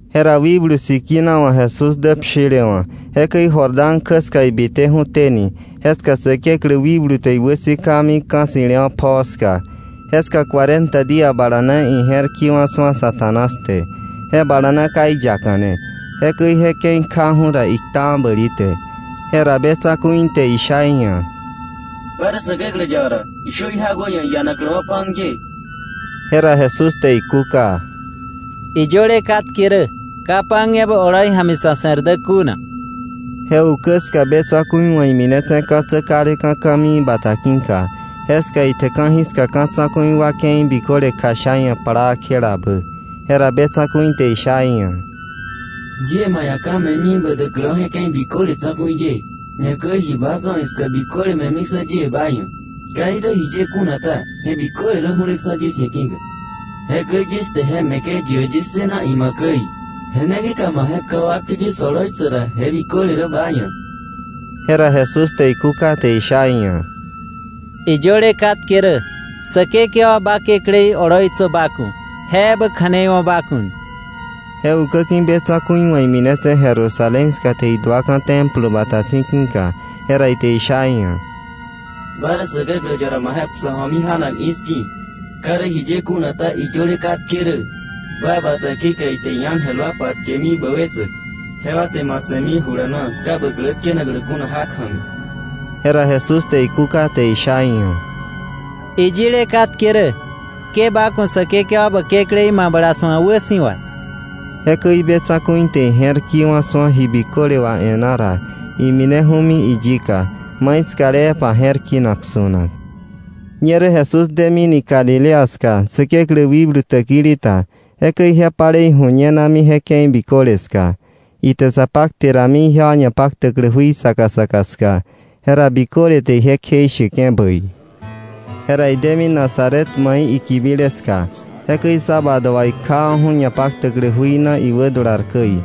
Jera Wikblu Sikina wa̱ Jesús dä pshilewa̱, jekäi Jordán kjä ska ibiteju̱teni, jeska Säkeklä wikblu te iwäsikami ka̱ ssi̱lewa̱ pjoo ska. Jeska cuarenta día bala na ije̱r ki̱wa̱ su̱a Satanás te. Je bala na ka iyakane. Jekäi je ke̱i kjaju̱ ra, iktawa̱ bäli te. Jera be tsa̱ku̱i te isha iia̱: —Ba rä Säkeklä yaba ra, ishö jí jak wä ia̱ iianakläwa̱ pan ye. Jera Jesús te ikúka: —Iyöle katke rä: ‘Ka pan ebä oloi ja̱mi sa̱ se̱r dä kuna.’ Je ukä ska be tsa̱ku̱i wa̱ iminetse̱ ka̱tsä kaleka̱ ka̱mii bata ki̱ka. Jeska ite ka̱jiska ka̱ tsa̱ku̱i wa ke̱i biköle kjasha iia̱ plaa kjelabä. Jera be tsa̱ku̱i te isha iia̱: —Yie ba ia̱ ka̱ me̱mi ba däkläwa̱ je ke̱i biköle tsa̱ku̱i ye, ñakäi ji baa tso̱ iska biköle me̱miksa̱ yie ba ia̱. Ka irä jiye kuna ta, je biköle rä ju̱leksa̱ yis ia̱ ki̱ka. Jekäi yis te je me̱ke̱ yi ia̱ yis ssëna ima̱k käi. Je ne ki̱ka ma je̱tkawa̱ wakte yis oloitsäk ra, je biköle rä ba ia̱. Jera Jesús te ikúka te isha iia̱: —Iyöle katke rä: “Säkekewa ba Kekläí oloitsö ba ku̱; je ebä kja̱nei wo̱ ba ku̱.” Je ukäki̱ be tsa̱ku̱i wa̱ iminetse̱ Jerusalén ska te iduaka̱ Templo bata si̱ ki̱ka. Jera ite isha iia̱: —Ba rä Säkeklä yaba ra, ma je̱k psö ju̱omi ja̱nak i̱ski̱. Ka irä jiye kuna ta, iyöle katke rä: ‘Ba bata ki̱ka ite iángel wa patkemi bä wetsäk, jewa te ma tse̱mi jula na, ka bä klä tkenaklä kuna jak ja̱mi.’ Jera Jesús te ikúka te isha iia̱: —Iyile katke rä: ‘Ke ba ku̱ Säkekewa ba Kekläí mabla su̱a wäsi̱wa.’ Jekäi be tsa̱ku̱i te ije̱r ki̱wa̱ su̱a ji biköle wà e̱ná ra, imineju̱mi iyika, maiskalepa je̱r kinak su̱nak. Ñerä Jesús demini Galilea ska, Säkeklä wikblu täkili ta. Jekäi ije palei ju̱ñenami je ke̱i biköle ska. Ite sa pakte rami ijewa ñapaktäklä jui saka saka ska. Jera biköle te ije kjeisheke̱ bäi. Jera idemi Nazaret mai ikibile ska. Jekäi sábado wà ikjawa̱ju̱ ñapaktäklä jui na iwädular käi.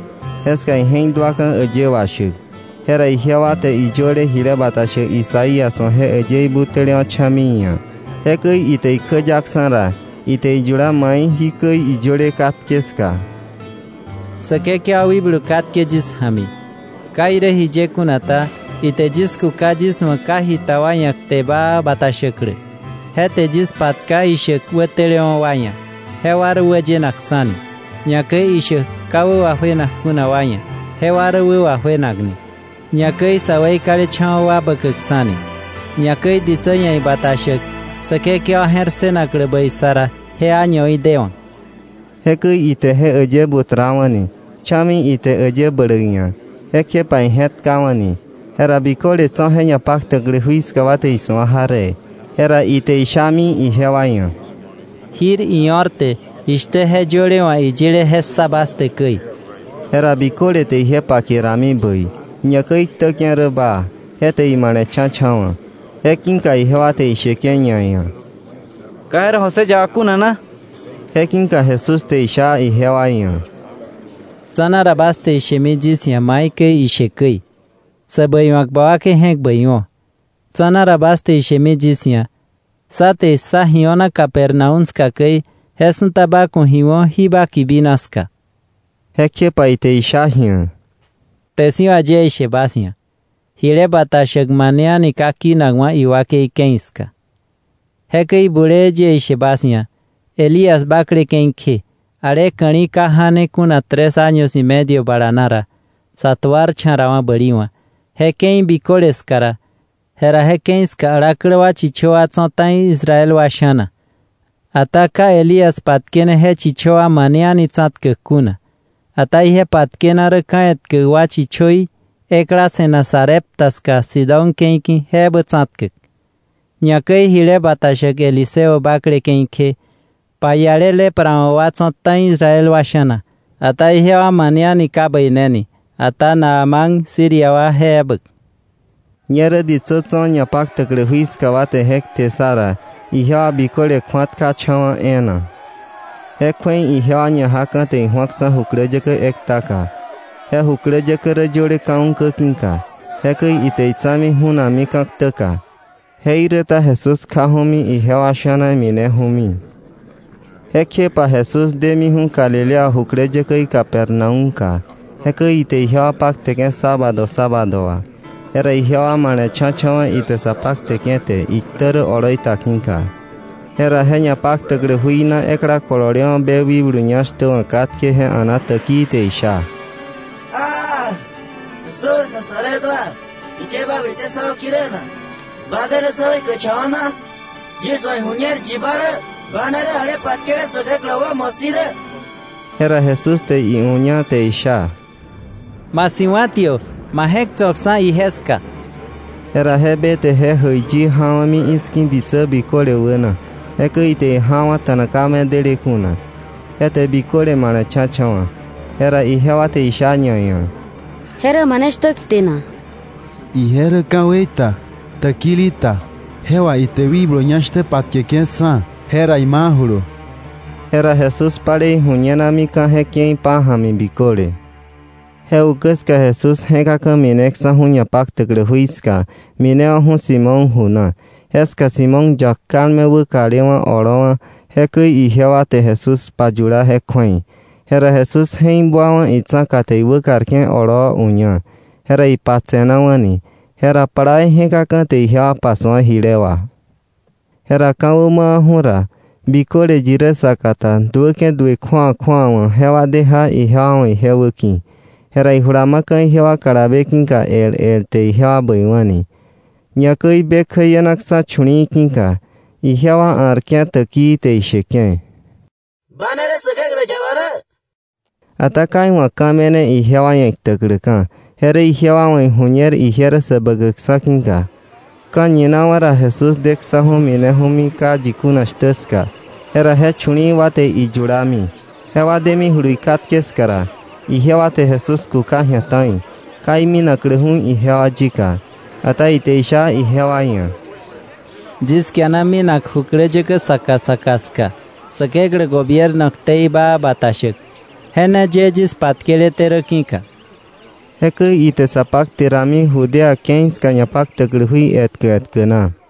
Jeska ije̱k duaka̱ äyë washäk. Jera ijewa te iyöle jile bata shäk Isaías wa̱ je äyëí butälewa̱ cha̱mi iia̱. Jekäi ite ikjäyaksa̱ ra, ite iyula mai jikäi iyöle katke ska: “Säkekewa wikblu katke yis ja̱mi. Ka irä jiye kuna ta, ite yis kuka yis wa̱ ka jita wa ia̱ kte baa bata shäklä. Je te yis patka ishäk wätelewa̱ wa ia̱, jewa rä wäyenakksa̱ni, ñakäi ishäk ka wä wajuenak kuna wa ia̱ jewa rä wä wajuenakni, ñakäi sä weikalecha̱wa̱ wa bäkäkksa̱ni, ñakäi ditsä ia̱ ibata shäk Säkekewa je̱r ssënaklä bäi sa ra, je añoí dewa̱.” Jekäi ite je äyë butrawa̱ni, cha̱mi ite äyë bläk ia̱, jekjepa ije̱tkawa̱ni. Jera biköle tso̱ je ñapaktäklä jui ska wa te isu̱a jaree. Jera ite ishami ijewa ia̱: —Jir io̱r te jishtä je yöle wa̱ iyile je ssa bas te käi. Jera biköle te ije pake rami bäi, ñakäi iktäke̱ rä baa, je te imale̱cha̱cha̱wa̱. Je ki̱ka ijewa te isheke̱ ñaia̱: —¿Ka je rä José yaba kuna na? Je ki̱ka Jesús te isha ijewa ia̱: —Tsa̱na ra bas te ishemi yis ia̱ maikäi ishe käi: ‘Sä bäiwa̱k, ba wakei je̱k bäi wo̱.’ Tsa̱na ra bas te ishemi yis ia̱: ‘Sá te issa ji o̱na Capernaúm ska käi, je su̱ta ba ku̱ ji wo̱ jí ba kibina ska.’ Jekjepa ite isha ji̱a: —Kte si̱ wà yie ishe bas ia̱: Jile bata shäk mane a̱ni ka kinakwa̱ iwakei ke̱i ska. Jekäi bulee yie ishe bas ia̱: Elías bakle ke̱i kje, ale ka̱li̱ ka ja̱ne kuna tres año y medio bala na ra, sa tuarcha̱rawa̱ bäli wa̱ je ke̱i biköle ska ra, jera je ke̱i ska alaklä wa chichö wa tso̱ ta̱i Israel wa sha̱na, ata ka Elías patkene je chichö wa mane a̱ni tsa̱tkäk kuna, ata ije patkena rä ka̱ etkä wa chichöí ekla se̱nak Sarepta ska, Sidón ke̱i ki̱, je ebä tsa̱tkäk. Ñakäi jile bata shäk Eliseo bakle ke̱i kje, paiale lepra wa̱ wa tso̱ ta̱i Israel wa sha̱na, ata ijewa mane a̱ni ka bäineni, ata Naamán Siria wa, je ebä. Ñerä ditsä tso̱ ñapaktäklä jui ska wa te je kte ssa ra, ijewa biköle kju̱atkacha̱wa̱ e̱e̱na. Je kju̱ei ijewa ñajaka̱ te iju̱aksa̱ jukläyäkä ektaka. Je jukläyäkä rä yöle ka̱ ukä ki̱ka. Jekäi ite itsa̱mi ju̱nakmi ka̱ ktäka. Jeiräta Jesús kjaju̱mi ijewa sha̱na mineju̱mi. Jekjepa Jesús demiju̱ Galilea jukläyäkäí Capernaúmka. Jekäi ite ijewa pakteke̱ sábado sábado wà. Jera ijewa male̱cha̱cha̱wa̱ ite sa pakteke̱ te, iktä rä oloi ta ki̱ka. Jera je ñapaktäklä jui na ekla kolole wa̱ be wikblu ñá shtä wa̱ katke, je a̱na täkii, te isha: —¡Aaj! Jesús Nazaret wa, ¿jiye ba bite sá wäki̱ rä na? ¿Ba de rä sá weikäkcha̱wa̱ na? Yis wa̱ iju̱ñer yi ba rä; ba ne rä ale patkele Säkeklä wa̱ wämo si̱ rä. Jera Jesús te iuña, te isha: —¡Ma si̱wa̱tiö, ma je̱k tso̱ksa̱ ije ska! Jera je be te je jäiyi ja̱wa̱mi i̱ski̱ ditsä biköle wäna. Jekäi ite ijawa̱ta̱na ka medele kuna. Je te biköle male̱cha̱cha̱wa̱. Jera ijewa te isha ñaia̱: —¿Je rä mane shtä kte na? ¡Ije rä ka̱wei ta, täkili ta, je wà ite wikblu ñá shtä wa patkeke̱ksa̱, jera imajulu! Jera Jesús palei ju̱ñenamika̱ je ke̱i pája̱mi biköle. Je ukä ska Jesús je̱kaka̱ mineksa̱ju̱ ñapaktäklä jui ska, minewa̱ju̱ Simón ju na. Jeska Simón yak kalme wäkalewa̱ oloowa̱, jekäi ijewa te Jesús payula je kju̱ei. Jera Jesús je̱k buawa̱ itsa̱ka te iwäkarke̱ oloo uña, jera ipatse̱nawa̱ni. Jera plaa ije̱kaka̱ te ijewa pasu̱a jile wà. Jera ka̱wä mawa̱ju̱ ra, biköle yi rä saka ta duäke̱ duë ta kju̱awa kju̱awa wa jewa de ja ijewa wa̱ ije wäki̱. Jera ijula ma̱ka̱ ijewa kalabe ki̱ka el el, te ijewa bäiwa̱ni. Ñakäi be kjäienaksa̱ chu̱li̱i̱ ki̱ka. Ijewa a̱rke̱ täkii te isheke̱: —¡Ba ne rä Säkeklä yaba rä! Ata ka iwa̱ ka̱ me̱ne ijewa ia̱ iktäkläka̱, je rä ijewa wa̱ iju̱ñer ije rä Säbäkäkksa̱ ki̱ka. Ka̱ñinawa̱ ra Jesús deksa̱ju̱ mineju̱mi ka yi kuna shtä ska. Jera je chu̱li̱i̱ wa te iyulami, jewa demijulu ikatke ska ra, ijewa te Jesús kuka ji̱a ta̱i, ka iminakläju̱ ijewa yika. Ata ite isha ijewa ia̱: —Yis kiana minak jukläyäkä saka saka ska Säkeklä gobierno ktei baa bata shäk, je ne ye yis patkeleté rä ki̱ka. Jekäi ite sa pakte rami, Judea ke̱i ska ñapaktäklä jui etkä etkä na.